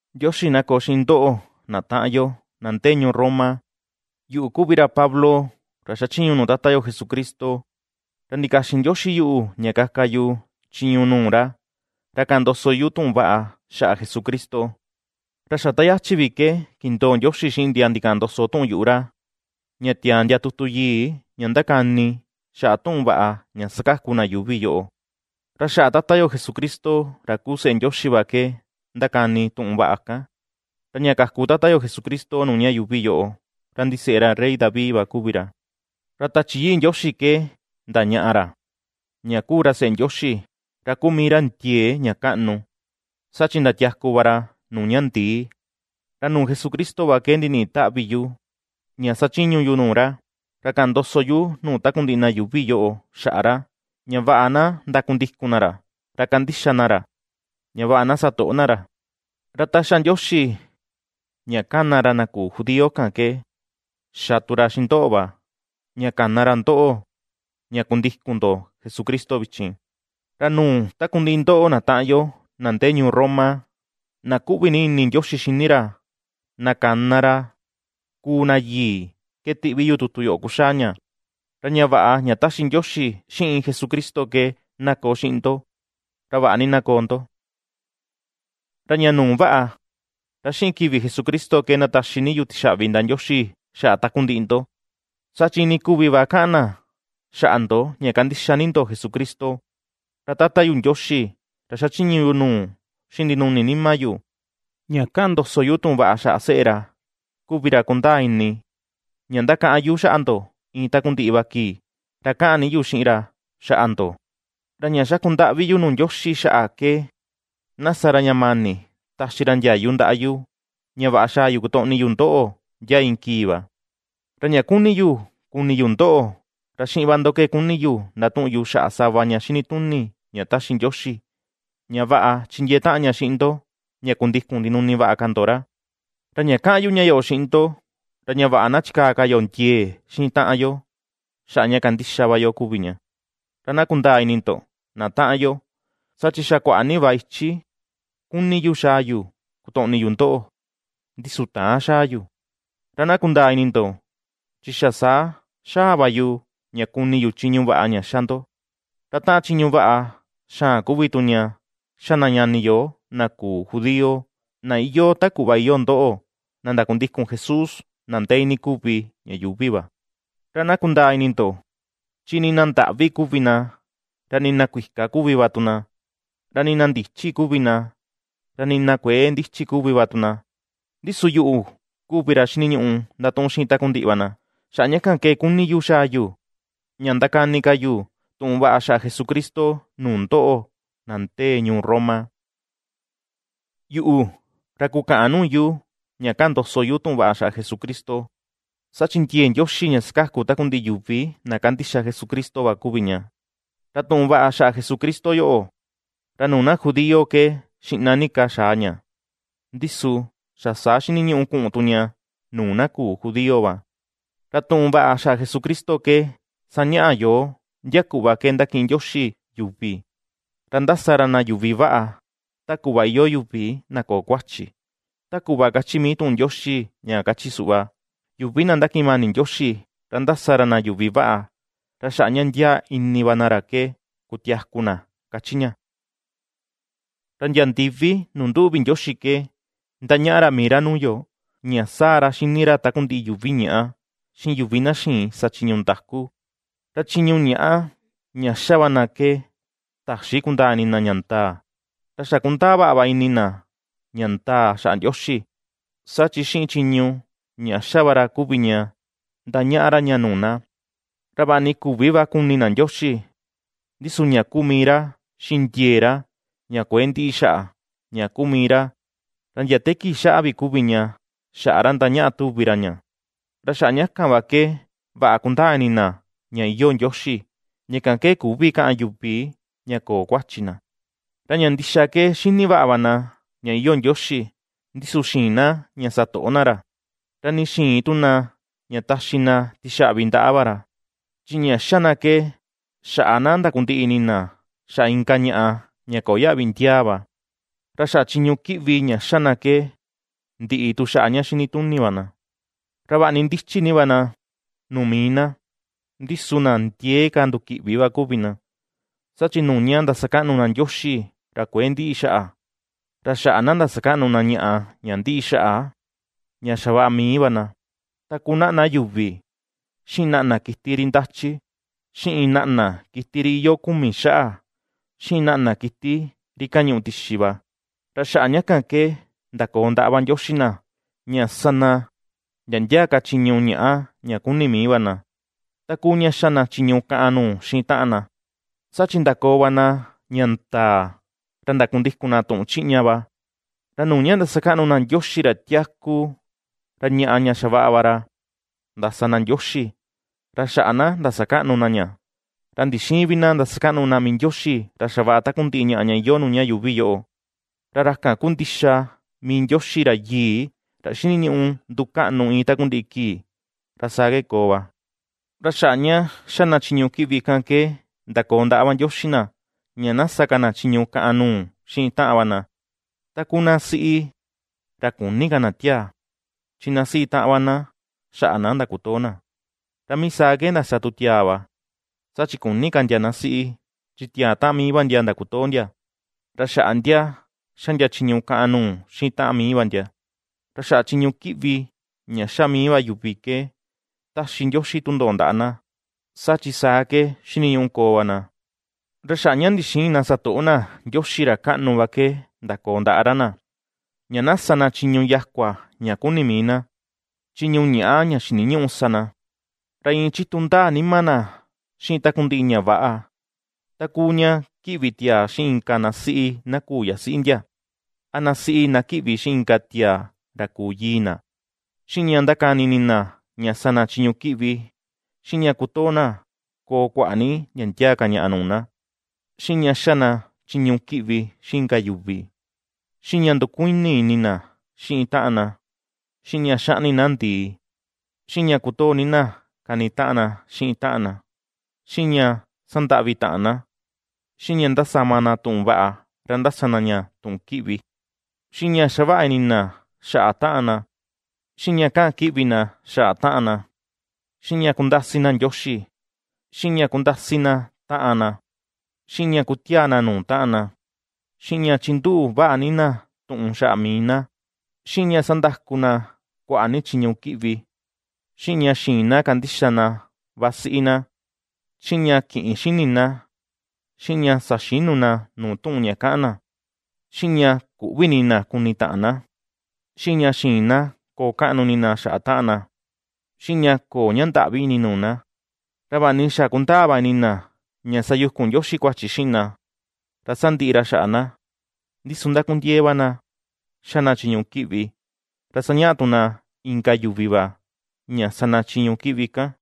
Ndioxi na koo xiꞌin ndoꞌo na taꞌan yo, na ndee ñuu Roma. Yuꞌu kuvi ra Pablo, ra xachiñu nuu Tata yo Jesucristo, ra ndikaxin Ndioxi yuꞌu ña kaka yu chiñu nuu ra, ra kaꞌan ndoso tuꞌun vaꞌa xaꞌa Jesucristo. Ra xa ta yachi vi ke kindoo Ndioxi xiꞌin ndia ndikaꞌan ndoso tuꞌun yuꞌu ra, ña tiaa ndia tutu yii, ña ndakani xaꞌa tuꞌun vaꞌa ña sakaku na yuuvi yoꞌo. Ra xaꞌa tata yo Jesucristo ra kuu seꞌe Ndioxi va ke ndakani tuꞌun vaꞌa kan. Ra ña kaku Tata yo Jesucristo nuu ñuꞌu ña yuuvi yoꞌo, ra ndiseꞌe ra rey David va kuvi ra. Ra Tachi Yii Ndioxi ke ndañaꞌa ra, ña kuu ra seꞌe Ndioxi, ra kuu mii ra ndiee ña kaꞌnu, saa chi ndatiaku va ra nuu ña ndii. Ra nuu Jesucristo va ke ndiniꞌi táꞌvi̱ yu ña sachiñu yu nuu ra, ra kaꞌan ndoso yu nuu takundiꞌi na yuuvi yoꞌo xaꞌa ra, ña vaꞌa na ndakundikun na ra, ra kandixa na ra, ña vaꞌa na sa toꞌo na ra. Ra ta ^xa Ndioxi ña kana ra na küu judío kan ke xa tu ra xiꞌin ndoꞌo va, ña kana ra ndoꞌo, ña kundikun ndo Jesucristo vichin. Ra nuu takundiꞌi ndoꞌo na taꞌan yo na ndee ñuu Roma, na kuꞌvi ni ini Ndioxi xíní ra, na kana ra ^kuu na yii, ke tiꞌvi yu tutu yoꞌo kuxaa ña. Ra ña vaꞌa ña taxi Ndioxi xiꞌin Jesucristo ke na koo xiꞌin ndo, ra vaꞌa ni na koo ndo. Ra ña nuu vaꞌa, ra xiꞌin kivi Jesucristo ke ^ndataxi ni yu tixaꞌvi ndaꞌa Ndioxi xaꞌa takundiꞌi ndo, saa chi iinii kuvi va kaꞌan na xaꞌa ndo ña kandixa ni ndo Jesucristo. Ra Tata yu Ndioxi, ra xachiñu yu nuu xiꞌin ndinuni nima yu, ña kaꞌan ndoso yu tuꞌun vaꞌa xaꞌa seꞌe ra, kuvi ra kundaa ini ña ^ndakaꞌan yu xaꞌa ndo iin takundiꞌi va kii, ra kaꞌan ni yu xiꞌin ra xaꞌa ndo. Ra ña xaku ndaꞌvi yu nuu Ndioxi xaꞌa ke, na sa ra ña mani taxi ra ndiayu ndaꞌa yu, ña vaꞌa xaa yu kutoꞌni yu ndoꞌo, ndia iin kii va. Ra ña ^kuni yu kuni yu ndoꞌo, ra xiꞌin va ndo ke kuni yu ndatuꞌun yu xaꞌa sava ña xinituni ña taxi Ndioxi, ña vaꞌa chindiee taꞌan ña xiꞌin ndo, ña kundikun ndinuni vaꞌa ka ndo ra. Ra ña kaꞌan yu ña yoꞌo xiꞌin ndo, ra ña vaꞌa na chikaa ka yo ndiee xiꞌin taꞌan yo, xaꞌa ña ^kandixa va yo kuvi ña. Ra na kundaa ini ndo na taꞌan yo, saa chi xa kuaꞌa ni va ichi ^kuni yu xaa yu kutoꞌni yu ndoꞌo, ndi su täan xaa yu. Ra na kundaa ini ndo, chi xa saa xaa va yu ña kuni yu chiñu vaꞌa ña ^xa ndo, ra taꞌan chiñu vaꞌa xaan kuvi tu ña xa na ñani yo na küu judío, na iyoo ta kuꞌva iyoo ndoꞌo, na ndakundikun Jesús, na ndee iinii kuvi ña yuuvi va. Ra na kundaa ini ndo, chi nii na ndaꞌvi kuvi na, ra nii na kuika kuvi va tu na, ra nii na ndichi kuvi na, ra nii na kuëe ndichi kuvi va tu na, ndi su yuꞌu kuvi ra xiniñuꞌu ndatuꞌun xiꞌin takundiꞌi va na. Xaꞌa ña kan ke kuni ni yu xaa yu, ña ndakani ka yu tuꞌun vaꞌa xaꞌa Jesucristo nuu ndoꞌo, na ndee ñuu Roma. Yuꞌu, ra kukäꞌan nuu yu ña kaꞌan ndoso yu tuꞌun vaꞌa xaꞌa Jesucristo, saa chi ndiee Ndioxi ña ^sakaku takundiꞌi yuvi na ^kandixa Jesucristo va kuvi ña. Ra tuꞌun vaꞌa xaꞌa Jesucristo yoꞌo, ra nuu na judío ke xiꞌna ni ka xa̱a ña, ndi su xa saa xiniñuꞌu kuꞌun tu ña nuu na küu judío va. Ra tuꞌun vaꞌa xaꞌa Jesucristo ke ^sañaꞌa yoo, ndia kuꞌva ke ^ndakiꞌin Ndioxi yuvi, ra ndasa ra na yuvi vaꞌa, ta kuꞌva iyoo yuvi na köo kuachi. Ta kuꞌva kachi mii tuꞌun Ndioxi ña kachi suꞌva: “Yuvi na ndakiꞌin mani Ndioxi, ra ndasa ra na yuvi vaꞌa, ra xaꞌa ña ndiaa ini va na ra ke kutiaku na”, kachi ña. Ra ndia ndivi nuu nduꞌu vi Ndioxi ke ^ndañaꞌa ra mii ra nuu yo, ña sáa̱̱ ra xini ra takundiꞌi yuvi ñaꞌá, xiꞌin yuvi na xïin sa chiñu ndaku; ra chiñu ñaꞌa, ña ^xa va na ke täxi kundaa ini na ña ndaa. Ra xa kundaa vaꞌa va ini na ña ndaa xaꞌa Ndioxi, saa chi xiꞌin chiñu ña ^xa va ra kuvi ña, ndañaꞌa ra ña nuu na. Ra vaꞌa ni küvi va kuni na Ndioxi, ndi su ña kuu mii ra, xiꞌin ndiee ra ña kuëe ndiꞌi xaꞌa ña kuu mii ra, ra ndia te kii xaꞌa vi kuvi ña xaꞌa ra ndañaꞌa tuvi ra ña, ra xaꞌa ña kan va ke vaꞌa kundaa ini na ña iyoo Ndioxi; ña kan ke küvi kaꞌan yuvi ña köo kuachi na. Ra ña ndixa ke xini vaꞌa va na ña iyoo Ndioxi, ndi su xïin na ña satoꞌo na ra, ra nii xïin tu na ña taxi na tixaꞌvi ndaꞌa va ra. Chi ña ^xa na ke, xaꞌa na ndakundiꞌi ini na xaꞌa inka ñaꞌa ña köo yaꞌvi ndiaa va, ra xaꞌa chiñu kiꞌvi ña ^xa na ke, ndiꞌi tu xaꞌa ña xini tuni va na. Ra vaꞌa ni ndichi ni va na nuu mii na, ndi su na ndiee ka ndukiꞌvi va kuvi na. Saa chi nuu ña ^ndasakaꞌnu na Ndioxi ra kuëe ndiꞌi xaꞌa, ra xaꞌa na ndasakaꞌnu na ñaꞌa ña ndiꞌi xaꞌa, ña xavaꞌa mii va na, ta kuu naꞌna yuvi, xiꞌin naꞌna kiti ri ndáchí, xiꞌin naꞌna kiti ri iyoo kumi xaꞌa, xiꞌin naꞌna kiti ri kañuꞌu tixi va. Ra xaꞌa ña kan ke ndakoo ndaꞌa va Ndioxi na, ña ^sa na ndia ndia ka chiñu ñaꞌa ña kuni mii va na, ta kuu ña ^xa na chiñu kaꞌan nuu xiꞌin taꞌan na. Saa chi ndakoo va na ña ndaa, ra ndakundikun na tuꞌun chiꞌña va, ra nuu ña ^ndasakaꞌnu na Ndioxi ra tiaku, ra ñaꞌa ña xavaꞌa va ra ndasa na ndioxi, ra xaꞌa na ndasakaꞌnu na ña, ra ndixïin vi na ndasakaꞌnu na mii Ndioxi ra xavaꞌa takundiꞌi ñaꞌa ña iyoo nuu ña yuuvi yoꞌo. Ra ra kan kuu ndixa mii Ndioxi ra Yii, ra xiniñuꞌu ndukaꞌnu iin takundiꞌi kii. Ra saa ke koo va. Ra xaꞌa ña ^xa na chiñu kiꞌvi kan ke ndakoo ndaꞌa va Ndioxi na, ña na ^sa ka na chiñu kaꞌan nuu xiꞌin taꞌan va na, ta kuu na siꞌi, ra küni ka na tiaa, chi ná siꞌi taꞌan va ná xaꞌa ná ndakutoo ná. Ra mii saa ke ndasa tu tiaa va, saa chi küni ka ndia ná siꞌi, chi tiaa taꞌan mii va ndia ndakutoo ndia. Ra xaꞌa ndia ^xa ndia chiñu kaꞌan nuu xiꞌin taꞌan mii va ndia. Ra xaꞌa chiñu kiꞌvi ña ^xa mii va yuvi ke ^taxi Ndioxi tundoꞌo ndaꞌa na, saa chi saa ke xiniñuꞌu koo va na. Ra xaꞌa ña ndixïin na satoꞌo na Ndioxi ra kaꞌnu va ke ndakoo ndaꞌa ra na, ña na ^sa na chiñu yakua ña kuni mii na, chiñu ñaꞌa ña xiniñüꞌu sa na. Ra iin chitu ndaa nima na xiꞌin takundiꞌi ña väꞌa, ta kuu ña kiꞌvi tiaa xiꞌin inka ná siꞌi ná küu yasiꞌi ndia, a ná siꞌi ná kiꞌvi xiꞌin inka tiaa ra küu yii na, xiꞌin ña ndákáni ini na sa na chiñu kiꞌvi, xiꞌin ña kutoo na koo kuaꞌa ni ndia ndia ka ñaꞌa nuu na, xiꞌin ña ^xa na chiñu kiꞌvi xiꞌin inka yuvi, xiꞌin ña ndukuini ini na xiꞌin taꞌan na, xiꞌin ña xaꞌni na ndii, xiꞌin ña kutoo ni na kanitaꞌan na xiꞌin taꞌan na, xiꞌin ña ^sandaꞌvi taꞌan na, xiꞌin ña ndasama na tuꞌun vaꞌa, ra ndasa na ña tuꞌun kiꞌvi, xiꞌin ña xavaꞌa ini na xaꞌa taꞌan na, xiꞌin ña kaꞌan kiꞌvi na xaꞌa taꞌan na, xiꞌin ña kundasi na Ndioxi, xiꞌin ña kundasi na taꞌan na, xiꞌin ña kutiaa na nuu taꞌan na, xiꞌin ña chinduꞌu vaꞌa ni na tuꞌun xaꞌa mii na, xiꞌin ña sandaku na kuaꞌa ni chiñu kiꞌvi, xiꞌin ña xïin na kandixa na vasiꞌi na, xiꞌin ña kïꞌin xini na, xiꞌin ña saxïnu na nuu tuꞌun ña kaꞌan na, xiꞌin ña küꞌvi ini na kuni taꞌan na, xiꞌin ña xïin na koo kaꞌnu ini na xiꞌin taꞌan na, xiꞌin ña köo ña ndaꞌvi ini nuu na. Ra vaꞌa ni xa kundaa va ini na ña sayukun Ndioxi kuachi xiꞌin na, ra sandiꞌi ra xaꞌa na, ndi su ndakundiee va na ña ^xa na chiñu kiꞌvi, ra sañaꞌa tu na inka yuvi va ña sa na chiñu kiꞌvi kan.